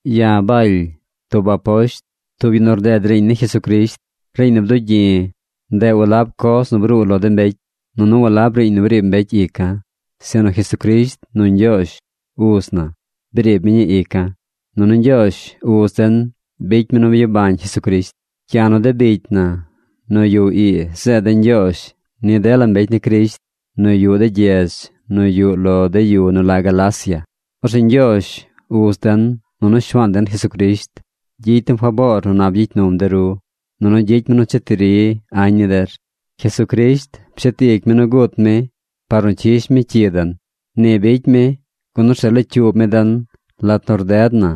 Ya̱ Baly tub aposht, tub yu nu rded riiñ ni Jesucrisht. Riiñ nu bdugyi̱, ndeꞌ walab coz nu bruu lo de mbecy, nunu walab riiñ nu briib mbecy ica̱, sinu Jesucrisht nu Ñgyoozh, uz na, briib mi ñii ica̱. Nunu Ñgyoozh, uz den bicy mi nu byabañ Jesucrisht. Ya̱ nu de bicy na nu yuꞌ ii zeed de̱ ñgyoozh ni dela mbecy ni Crisht nu yuꞌ de gyedz nu yuꞌ lo de yu nu la Galacia. Orzeꞌ Ñgyoozh, uz den, nunu Shuaan den Jesucrisht gyicy dem faboor nu nap gyicy num de ru, nunu gyicy mi nu cheti ri añ ni der. Jesucrisht pshet ic mi nu gut mi par nu cyish mi cyi den. Ni bicy mi, gun orzeꞌ locyuub mi den lat nu rded na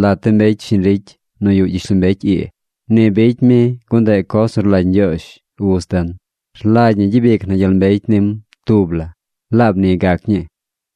lat de mbecy shiñ ricy nu yuꞌ gyishlombecy ii. Ni bicy mi gun ndeꞌ coz nu rlagy Ñgyoozh, uz den. Rlagy ñi gyabic na gyel mbecy nim tub la. ¡Laab ni gac ñii!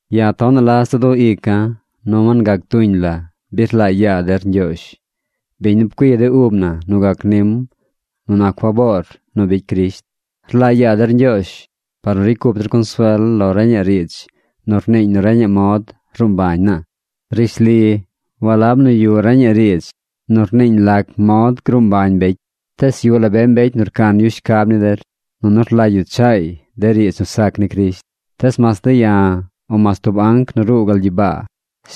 Ya̱ tonaꞌ la za du ica̱ nu wangac tuñ la bi rlaa yaa der Ñgyoozh, biñ nu pcui de ub na nu gac nim nu nac faboor nu bicy Crisht. Rlaa yaa der Ñgyoozh par nu ricy cup der consuel lo reñaꞌ riidz nu rniiñ nu reñaꞌ mod ruu mbañ naa. Rishli walab nu yuꞌ reñaꞌ riidz nu rniiñ lac mod gruu mbañ mbecy, tees yuꞌ la be mbecy nu rcan yu shcab ni der, nunu rlagy yu chaay de riidz nu sac ni Crisht. Tees mas de̱ ya̱, o mas tub anc nu ruu gal gyibaa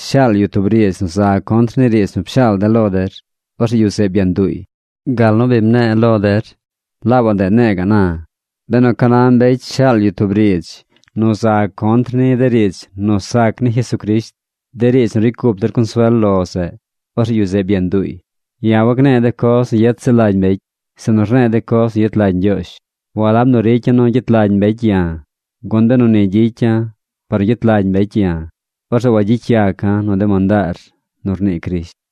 shaal yu tub riidz nu za contr ni riidz nu pshaal de̱ lo der, orzeꞌ yu zeꞌ byanduuy. Gal nu bi mne̱e̱ lo der, laabaꞌ ndeꞌ ne̱e̱ ga̱ꞌ na. Benu ca na mbecy shaal yu tub riidz nu za contr ni de riidz nu sac ni Jesucrisht, de riidz nu ricy cup der consuel lo zeꞌ, orzeꞌ yu zeꞌ byanduuy. Ya̱ wagne̱e̱ de coz nu yet ziꞌl lagy mbecy, sinu rne̱e̱ de coz nu yet lagy Ñgyoozh. Walab nu ricya̱ nu gyet lagy mbecy ya̱, gun benu ni gyicya̱ par nu gyet lagy mbecy ya̱, orzeꞌ wagyicy yaca̱ nu de mandaar nu rnii Crisht.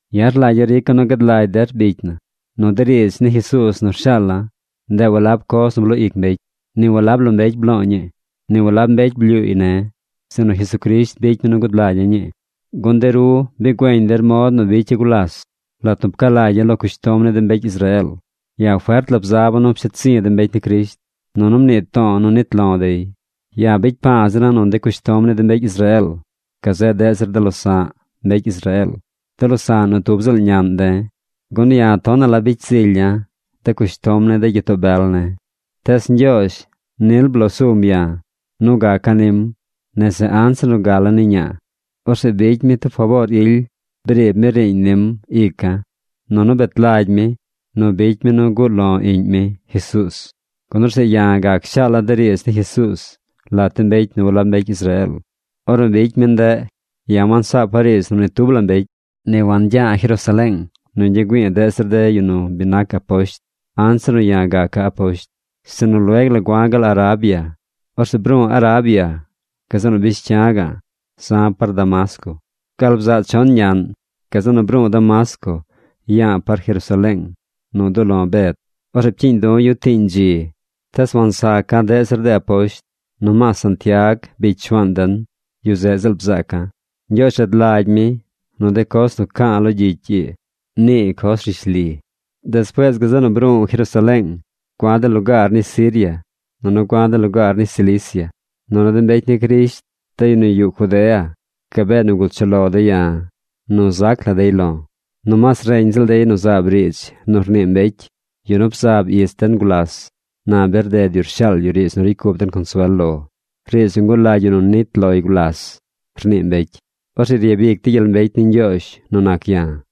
Ya̱ rlagya̱ rica̱ nu gad lagy der bicy na, nu de riidz ni Jesuuz nu rshaala̱, ndeꞌ walab coz nu bloo ic mbecy. Ni walab lo mbecy blo̱o̱ ñii. Ni walab mbecy blyuuy ne̱. Sinu Jesucrisht bicy mi nu gud lagya̱ ñii. Gun de ru bi güeñ der mod nu bicya̱ gulas, lat nu pca lagya̱ lo cushtom ni de mbecy Israeel. Ya̱ fert la bzaba̱ nu psheed zi̱ de mbecy ni Crisht. Nunu mnii to̱o̱ nu nit lo̱ dey. Ya̱ bicy pa̱a̱ zira̱ nu de cushtom ni de mbecy Israeel gazeꞌ deꞌ zir de losa̱ꞌ mbecy Israeel, de losa̱ꞌ nu tub ziꞌl ñaꞌn de̱, gun ya̱ tonaꞌ la bicy zilya̱ de cushtom ni de gyitoo bel ne̱. Tees Ñgyoozh nil bloo sum ya̱ nu gaca̱ nim nese anzir nu gala̱ ni ñaa. Orzeꞌ bicy mi tub faboor ily briib mi riiñ nim ica̱. nu bicy mi nu guꞌ lo̱ iꞌñ mi, Jesuuz, gun orzeꞌ ya̱ gac shaala̱ riidz ni Jesuuz lat de mbecy nu walab mbecy Israeel. Ornu bicy mi ndeꞌ, ya̱ wansaapa̱ riidz nu ni tub la mbecy. Ni wancha̱ Jerusaleeng nu ñgya̱ güi̱i̱ deꞌ zir de yu nu bi nac aposht anzir nu ya̱ gaca̱ aposht. Sinu lueg la gua̱ gal Arabia. Orzeꞌ bru̱u̱ Arabia, gazeꞌ nu bish cya̱ za̱ par Damasco. Gal bzaꞌ chon ñaꞌn, gazeꞌ nu bru̱u̱ Damasco ya̱a̱ par Jerusaleeng nu duꞌ lo̱ Bed. Orzeꞌ pcyiiñ du̱ yu tiiñ dzi. Tees wansaca̱ deꞌ zir de aposht. Nomaas Santiag bicy Shuaan den, yu zeꞌ ziꞌl bzaaca̱. Ñgyoozh rad lagy mi nu de coz nu ca̱a̱ lo gyicy ii, nii coz rishli. Despuees gazeꞌ nu bru̱u̱ Jerusaleeng. Gua̱ de lugaar ni Siria nunu gua̱ de lugaar ni Cilicia. Nunu de mbecy ni Crisht, de yu nu yuꞌ Judea, gabee nigul chuꞌ lo dey ya̱ nu zac la dey lo̱. Nomaas reñ ziꞌl dey nu zaab riidz nu rnii mbecy: “Yu nu bzab ich den gulas, na bi rded yu rshaal yu riidz nu ricy cup den consuel lo, riidz nu ngulagy yu nu nnit loy gulas”, rnii mbecy. Orzeꞌ ryabicy dey gyel mbecy ni Ñgyoozh nu nac ya̱.